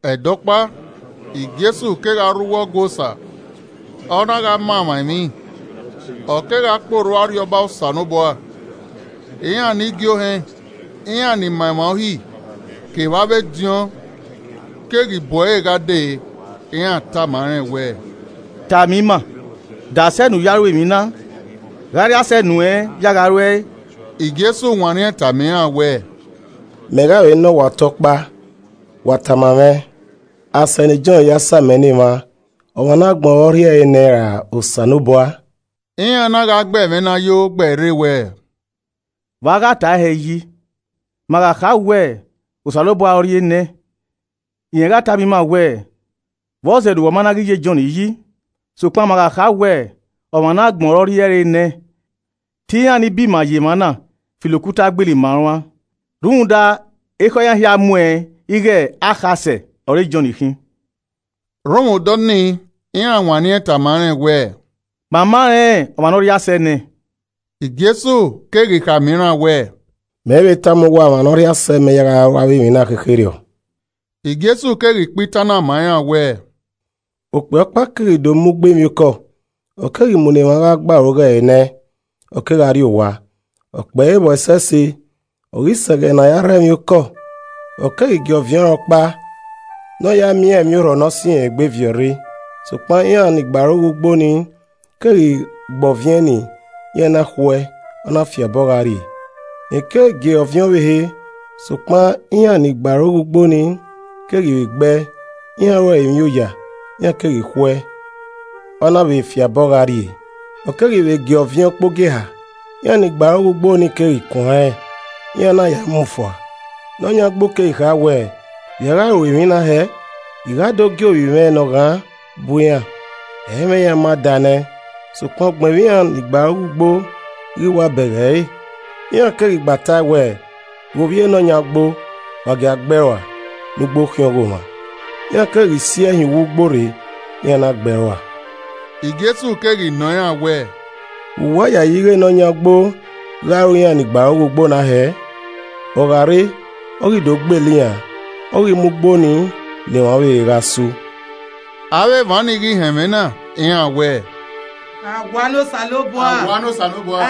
Ẹdẹ ọkpa, Jesu kegha rre uwu Ọgua Osa, ọ na gha ma emwa emwi, ọ kegha kpe orhu Arriọba Osanobua, iran ne igie ohẹn, iran ni ma emwa Uhi kevbe avbe ediọn keghi bu ẹre gha dee. Iran tama rẹn wẹẹ, “Tama ima, de asẹ ne u mwẹ ne u ya ru avbe emwi na? Gha ọ rhie asẹ nuẹn ya gha ru ẹe?” Jesu wanniẹn tama iran wẹẹ, “Mẹ gha vbe nọ uwa ọta ọkpa, wa tama mwẹ, Asẹ ne Jọn ya samẹ ne emwa, ọmwa ne agbọn ọre ọ rhie ẹre nẹẹn ra Osanobua?” Iran na gha gbe ẹmwẹ na yo gbe ẹe rre wẹẹ, “Vbe a gha tae hẹ yi? Ma gha kha wẹẹ, ‘Osanobua ọ rhie nẹ’ rẹn gha tama ima wẹẹ, ‘Vbọzẹ ne uwa ma ghi na ya Jọn yi?’ Sokpan ma gha kha wẹẹ, ‘Ọmwa ne agbọn ọre ọ rhie ẹre nẹẹn,’ te iran ni bima ye emwa na filo okuta gbele ima uan, rhunmwuda ekhọe iran hia muẹn ighẹ akhasẹ ọre Jọn khin.” Rhunmwuda ọnii iran wanniẹn tama rẹn wẹẹ, “Ma ma rẹn ọmwa ne ọ rhie asẹ nẹẹn.” Jesu keghi khama iran wẹẹ, “Mẹ i vbe tama uwa ọmwa ne ọ rhie asẹ mẹ ya gha ru avbe emwi na khekherriọ.” Jesu keghi kpa itan na ma iran wẹẹ, “Okpia ọkpa keghi do mu ugbo emwiokọ, ọ keghi mu ne emwa gha gbe aro ghe nẹẹn. Ọ kegha rrie owa, ọ kpẹe vbọ ẹsẹse. Ọ ghi sẹ ẹghẹ ne a ya rhọ emwiokọ, ọ keghi gie ọviẹn ọnrẹn ọkpa ne ọ ya miẹn iran emwiorhọ ne ọ sẹ irẹn egbe viọ rre. Sokpan iran ni gbe aro ghe ugbo nii keghi gbe ọviẹn ni, iran na khu ẹe, ọ na fiabọ gha rrie. Rẹn keghi vbe gie ọviẹn ọvbehe, sokpan iran ni gbe aro ghe ugbo nii keghi vbe gbe ẹe, iran ru ẹre emwi oya, iran keghi khu ẹe, ọ na vbe fiabọ gha rrie. Ọ keghi vbe gie ọviẹn ukpogieha, iran ni gbe aro ghe ugbo nii keghi kuan rẹn, iran na ya mu fua. Ne ọ yan ugbo keghi kha wẹẹ, ‘Vbe i a gha ru emwi na hẹẹ? I gha do gie ovbi mwẹ ne ọ ghan bu iran, ẹ i mwẹ iran ma daa nẹ.’ Sokpan ugbẹn vbe iran ni gbe aro ghe ugbo ghi wa bẹghe ẹre, iran keghi gba tae wẹẹ, ‘Ghe ovbi e ne ọ yan ugbo. Wa gia gbe ẹe rua, ne ugbo khian ọghomwa.’ Iran keghi si ẹe hin uwu ugbo rre, iran na gbe ẹe rua.” Jesu keghi nọ iran wẹẹ, “Vbe uwa yayi ighẹ ne ọ yan ugbo gha ru iran hẹ? Ọ gha re, ọ ghi do gbele iran uan, ọ ghi mu ugbo ni ne emwa ọvbehe gha gbearoghe.” Avbe emwa nii ghi họn ẹmwẹ na, iran wẹẹ, “Awua ne Osanobua.”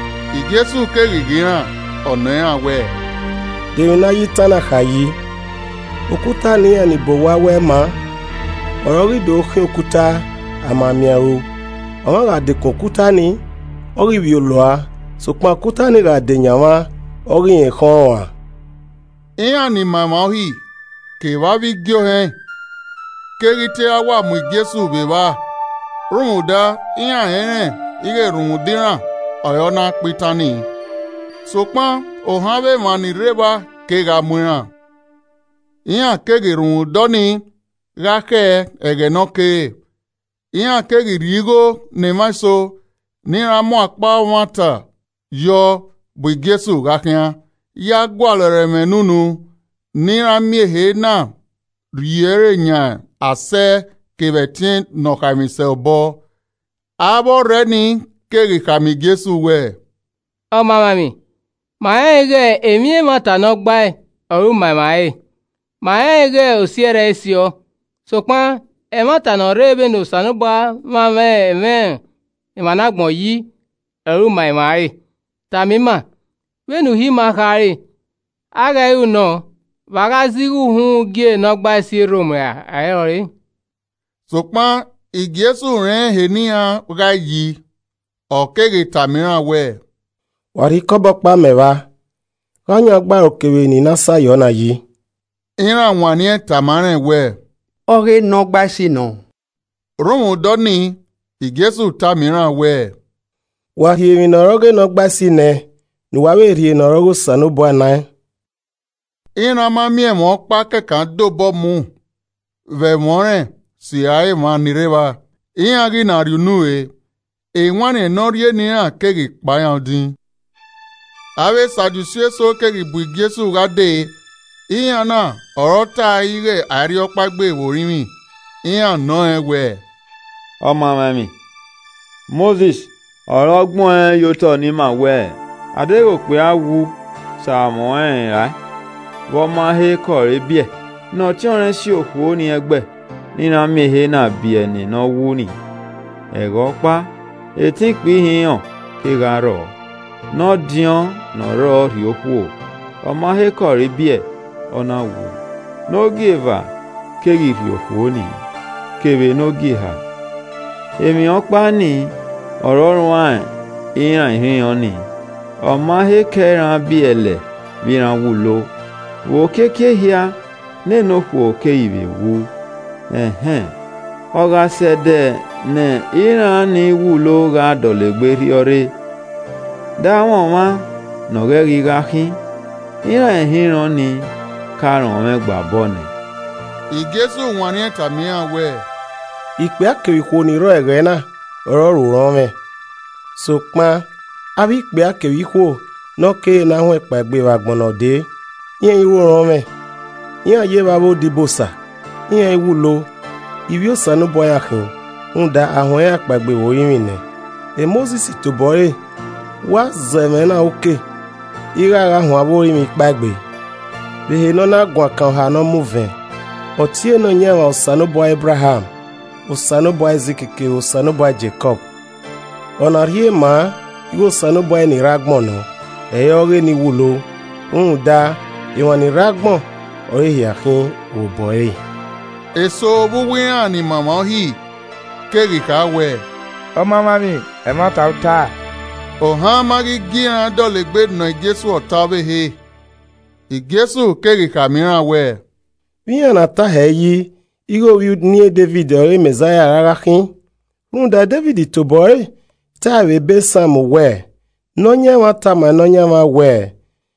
Jesu keghi ghe iran, ọ nọ iran wẹẹ, “De emwi ne a ya itan na kha yi i? “ ‘Okuta ne iran ni bọ owa wẹ ẹ i maa Ọre ọ ghi do khian okuta ama miẹn a i ru.’ Ọmwa gha dekun okuta nii, ọ ghi vbiolo ua sokpan okuta ni gha deyan ọmwa, ọ ghi rẹn khẹn ọẹn ruan.” Iran ni ma emwa Uhi, kevbe avbe igie ohẹn keghi te ra wa mu Jesu vbe evba rhunmwuda iran rẹnrẹn ighe rhunmwuda iran ọre ọ na kpa itan ni, sokpan ohan avbe emwa ni rre evba kegha mu iran. Iran keghi rhunmwuda ọnii gha khẹ ẹghẹ ne ọ kere. Iran keghi rhie igho ne emwa eso ne iran mu akpa ọmwata yọ bu Jesu gha khian ya gualọ ẹre ẹmwẹ ne unu ne iran miẹn ehe na rhie ẹre yan asẹ kevbe ẹtin Ne ọ khaemwisẹ obọ. Avbe ọrhẹ ni keghi khama Jesu wẹẹ, “Ọmamwaemwi, ma rẹnrẹn ighẹ emwi ẹmwata ne ọ gbae ọre u ma emwa ẹre. Ma rẹnrẹn ighẹ osi ẹrrẹ i siọ, sokpan ẹmwata ne ọ rre vbene Osanobua mwamwa ẹmwẹ emwa ne agbọn yi ọre u ma emwa re. Tama ima, vbene Uhi ima khare, a i ghẹ ru nọ vbe a gha zẹ igho uhunmwu gie Nọgbaisi e Rom ra ẹ i rọre?” Sokpan Jesu rẹn ehe ne iran ghae yi, ọ keghi tama iran wẹẹ, “Wa rhie ikọbọ ọkpa mẹ vba. Gha ọ yan ugbaro kevbe eni ne a sa yọ na yi?” Iran wanniẹn tama rẹn wẹẹ, “Ọghe Nọgbaisi nọ.” Rhunmwuda ọnii, Jesu tama iran wẹẹ, “Wa rhie emwi ne ọre ọghe Nọgbaisi nẹẹn ne uwa vbe rhie ne ọre ọghe Osanobua naẹn.” Iran ma miẹn ẹmwẹ ọkpa kẹkan de obọ mu vbe ẹmwẹ ọnrẹn sirra emwa ni ne evba, iran ghi na rhie unu re, ewanniẹn ne ọ rhie ne iran keghi kpan iran odin. Avbe Sadusi eso keghi bu Jesu gha dee. (Iran na ọre ọ tae ighẹ a i rhiọkpaegbe vbe orinmwi.) Iran nọ rẹn wẹẹ, “Ọmamwaemwi. Mosis ọre ọ gbẹn ọẹn ye otọ ne ima wẹẹ, ‘Adeghẹ okpia wu sẹ amwẹ rae vbe ọ ma he kẹ ọre biẹ, ne ọtiọnrẹn si okhuo ni ẹgbẹ ne iran miẹn ehe na biẹ ne ne ọ wu ni.’ Ẹghẹ ọkpa, etẹn ikpia ihinrọn kegha rrọọ. Ne ọdiọn ne ọ rrọọ rhie okhuo, ọma he ke ọre biẹ, ọ na wu. Ne ogieva keghi rhie okhuo nii. Kevbe ne ọ gieha, emwi ọkpa ni ọre ọ rruan iran ihinrọn nii, ọma he kẹ iran biẹlẹ vbe iran wulo, vbe okiekie ehia, nene okhuo keghi vbe wu. Ẹn hẹn, ọ gha sẹ ẹdẹ ne iran ni wulo gha dọlegbe rhiọrre, de amwẹ ọmwa ne ọ ghẹ ghi gha khin? Iran ihinrọn nii ka rọnmwẹ ọẹn gba obọ nẹ!” Jesu wanniẹn tama iran wẹẹ, “Ikpia kevbe ikhuo ni rrọ ẹghẹ na ọre ọ ru orọnmwẹ. Sokpan avbe ikpia kevbe ikhuo ne ọ kere ne a huẹn kpaegbe vbe agbọn ne ọ dee, iran i ru orọnmwẹ. Iran ye vbe avbe odibosa, iran i wulo. Ivbi Osanobua iran khin, rhunmwuda a huẹn iran kpaegbe vbe orinmwi nẹ. Mosis tobọ ẹre wa zẹ ẹmwẹ na uke ighe a gha huẹn avbe orinmwi kapegbe. Vbehe ne ọ na guan kan oha ne ọ mu vẹn, ọ tie Nọyaẹnmwa ‘Osanobua Ebraham, Osanobua Aizik kevbe Osanobua Jekọb.’ Ọna rhie maa ighe Osanobua eni rre agbọn nọ, ẹ i re ọghe eni wulo, rhunmwuda emwa ni rre agbọn ọre ehia khin vbe obọ ẹre.” Eso vbe uwu iran ni ma emwa Uhi keghi kha wẹ, “Ọmamwaemwi, ẹmwata u tae.” Ohan ma ghi gie iran dọlegbe nọ Jesu ọta ọvbehe. Jesu keghi khama iran wẹẹ, “Vbe iran na tae hẹ yi ighe ovbi uniẹn Devid ọre Mẹzaia ra gha khin? Rhunmwuda Devid tobọ ẹre tae vbe ebe Psalm wẹẹ, “ ‘Nọyaẹnmwa tama Nọyaẹnmwẹ wẹẹ: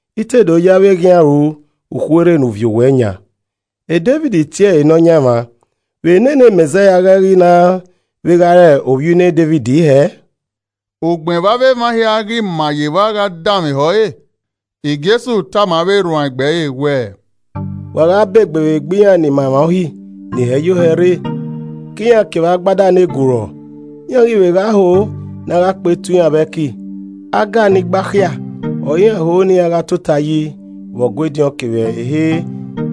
I te do ye avbe eghian an ru ukhuerhe ne u viọ owẹ yan.’ Devid tie ẹre Nọyaẹnmwa, vbe ne ne Mẹzaia ghẹ ghi na vbe gha re ovbi uniẹn Devid hẹẹ?” Ugbẹn vbe emwa hia ghi ma ye evba gha danmwehọ ẹre, Jesu tama avbe erhuanegbe ẹre wẹẹ, “Wa gha ba egbe vbe egbe iran ni ma emwa Uhi ni hẹ yo hẹ rre, ke iran kevbe agbada ne gurọọ, iran ghi vbe gha ho ne a gha kpe tuẹ iran vbe ẹki, aga iran ni gbakhia ọre iran ho ne iran gha tota yi vbe Ọgua ediọn kevbe ehe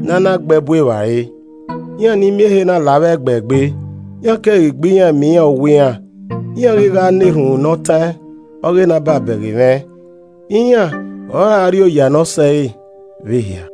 ne a na gbe ẹbu evbare. Iran ni miẹn ehe na la avbe ẹgbẹ egbe, iran keghi gbe iran miẹn iran owa iran, iran ghi gha na erhunmwu ne ọ taẹn ọghe ne a ba bẹghe mwẹ. Iran ọre a ra rri ọre oya ne ọ sẹ re vbe ehia.”